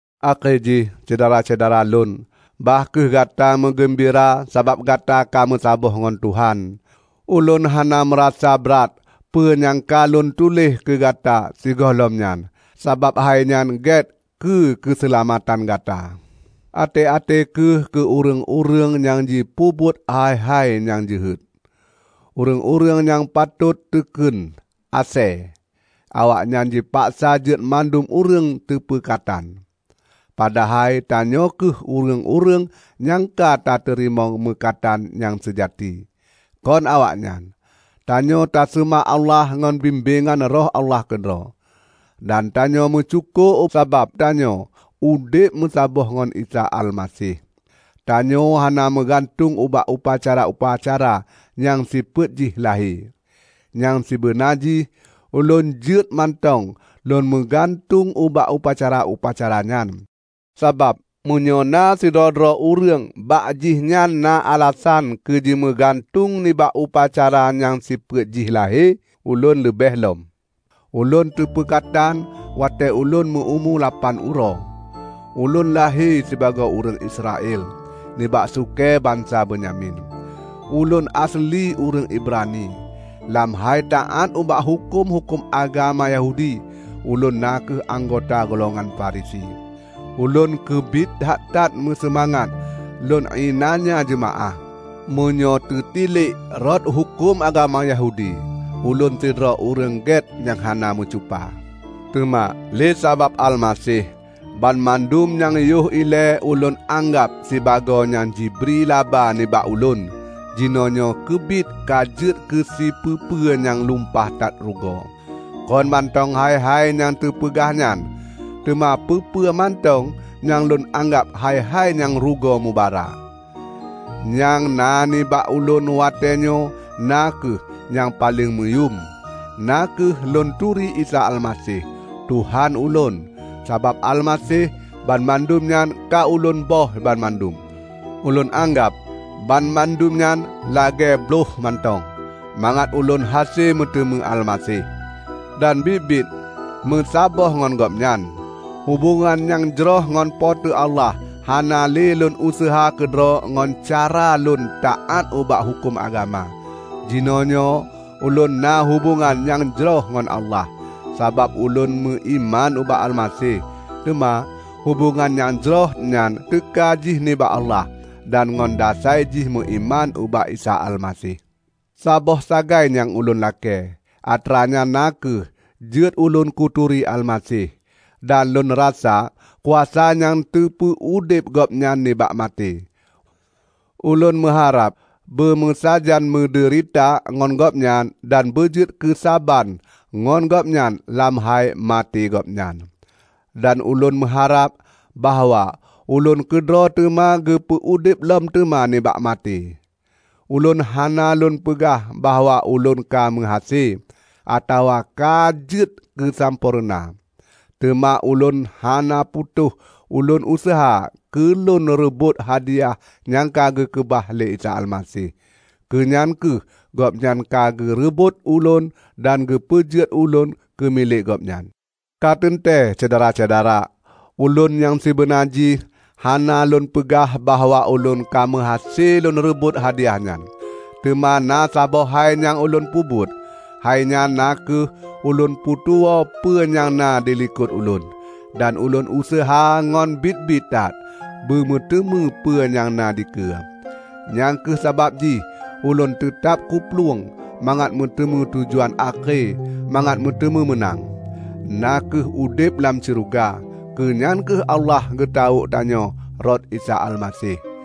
Akhé jih, Syedara-syedara lôn, bah kheueh gata meugeumbira sabab gata ka meusaboh ngon Tuhan. Ulôn hana meurasa brat peue nyang ka lôn tuléh keu gata sigohlom nyan; sabab hainyan gét keu keuseulamatan gata. Até-até kheueh keu ureuëng-ureuëng nyang jipeubuet hai-hai nyang jeuhet, ureuëng-ureuëng nyang patot teukheun 'Asée'. Awaknyan jipaksa jeuet mandum ureuëng teupeukatan. Padahai tanyoe kheueh ureuëng-ureuëng nyang ka tateurimong meukatan nyang seujati, kon awaknyan. Tanyoe taseumah Allah ngon bimbéngan Roh Allah keudroe, dan tanyoe meusyukoe sabab geutanyoe udeb meusaboh ngon Isa Almaseh. Tanyoe hana meugantung ubak upacara-upacara nyang sifeuet jih lahé. Nyang sibeuna jih ulôn jeuet mantong lôn meugantueng ubak upacara-upacara nyan. Sabab meunyoe na sidroe-droe ureuëng bak jih nyan na alasan keujimeugantung nibak upacara nyang sifeuet jih lahé, ulôn leubeh lom. Ulôn teupeukatan watée ulôn meu-umu lapan uroe. Ulôn lahé sibagoe ureuëng Israel, nibak sukée bansa Benyamin; ulôn aseuli ureuëng Ibrani. Lam hai taát ubak huköm-huköm agama Yahudi, ulôn na kheueh anggota golongan Farisi. Ulôn keubiet that-that meuseumangat lôn iénanya jeumaáh. Meunyoe teutilek rot huköm agama Yahudi, ulôn sidroe ureuëng gét nyang hana meucupa. Teuma lé sabab Almaseh, banmandum nyang yoh ilée ulôn anggab sibagoe nyang jibri laba nibak ulôn, jinoenyoe keubiet ka jeuet keusipeu-peu nyang lumpah that rugoe. Kon mantong hai-hai nyang teupeugah nyan, teuma peue-peue mantong nyang lôn anggab hai-hai nyang rugoe mubara. Nyang na nibak ulôn watée nyoe na kheueh nyang paleng meuyuem; na kheueh lôn turi Isa Almaseh, Tuhan ulôn. Sabab Almaseh, banmandum nyan ka ulôn böih banmandum. Ulôn anggab banmandum nyan lagée bloih mantong, mangat ulôn hase meuteumé Almaseh, dan biet-biet meusaboh ngon Gobnyan. Hubongan nyang jroh ngon Po teu Allah hana lé lôn useuha keudroe ngon cara lôn taát ubak huköm agama. Jinoenyoe ulôn na hubongan nyang jroh ngon Allah, sabab ulôn meuiman ubak Almaseh. Teuma, hubongan nyang jroh nyan teuka jih nibak Allah, dan ngon dasai jih meuiman ubak Isa Almaseh. Saboh sagai nyang ulôn lakée, atra nyan na kheueh jeuet ulôn kuturi Almaseh, dan lôn rasa kuasa nyang teupeu-udeb Gobnyan nibak maté. Ulôn meuharab beumeusajan meudeurita ngon Gobnyan dan beujeuet keusaban ngon Gobnyan lam hai maté Gobnyan. Dan ulôn meuharab bahwa ulôn keudroe teuma geupeu udeb lom teuma nibak maté. Ulôn hana lôn peugah bahwa ulôn ka meuhase, atawa ka jeuet keusampoereuna. Teuma ulôn hana putôh lôn useuha keu lôn reubot hadiah nyang ka geukeubah lé Isa Almaseh. Keunyan kheueh Gobnyan ka geureubot ulôn dan geupeujeuet ulôn keumilék Gobnyan. Ka teuntée, Syedara-syedara, ulôn nyang sibeuna jih hana lôn peugah bahwa ulôn ka meuhase lôn reubot hadiah nyan. Teuma na saboh hai nyang ulôn peubuet, hainyan na kheueh ulôn putuwoe peue nyang na dilikot ulôn, dan lôn useuha ngon biet-biet that beumeuteumé peue nyang na dikeue. Nyang kheueh sabab jih ulôn teutab kuplueng mangat meuteumé tujuan akhé mangat meuteumé meunang, na kheueh udeb lam syeuruga; keu nyan kheueh Allah geutawök tanyoe rot Isa Almaseh.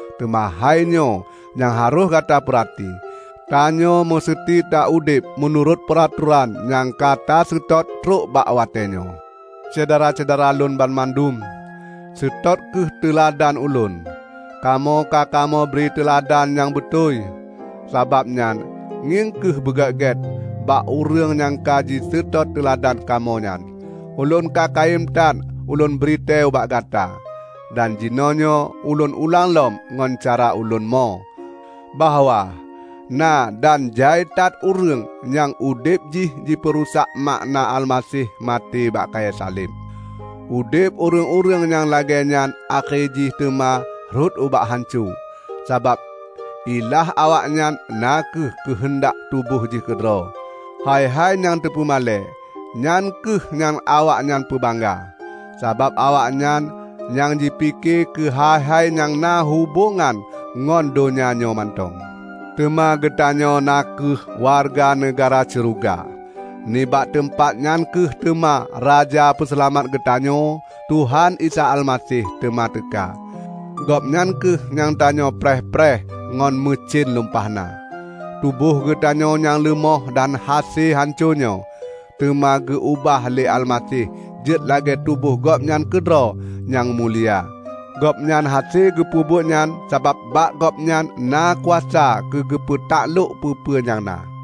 Teuma hainyoe nyang harôh gata peurati: Tanyoe meuseuti taudeb meunurot peuratoran nyang ka taseutôt trok bak watée nyoe. Syedara-syedara lôn banmandum! Seutôt kheueh teuladan ulôn. Kamoe ka kamoe bri teuladan nyang beutôi, sabab nyan ngieng kheueh beugét-gét bak ureuëng nyang ka jiseutôt teuladan kamoe nyan. Ulôn ka kayém that ulôn britée ubak gata, dan jinoenyoe ulôn ulang lom ngon cara ulôn mo, bahwa na dan jai that ureuëng nyang udeb jih jipeurusak makna Almaseh maté bak kayée saleb. Udeb ureuëng-ureuëng nyang lagée nyan akhé jih teuma rhot ubak hanco, sabab ilah awaknyan na kheueh keuheundak tuboh jih keudroe. Hai-hai nyang teupeumalée, nyan kheueh nyang awaknyan peubangga; sabab awaknyan nyang jipike keuhai-hai nyang na hubongan ngon donya nyoe mantong. Teuma geutanyoe na kheueh wareuga neugahra syeuruga. Nibak teumpat nyan kheueh teuma Raja Peuseulamat geutanyoe, Tuhan Isa Almaseh, teuma teuka. Gobnyan kheueh nyang tanyoe preh-preh ngon meucen lumpah na. Tuboh geutanyoe nyang leumoh dan hase hanco nyoe, teuma geu-ubah lé Almaseh jeuet lagée tuboh Gobnyan keudroe nyang mulia. Gobnyan hase geupeubuet nyan sabab bak Gobnyan na kuasa keugeupeutaklok peue-peue nyang na.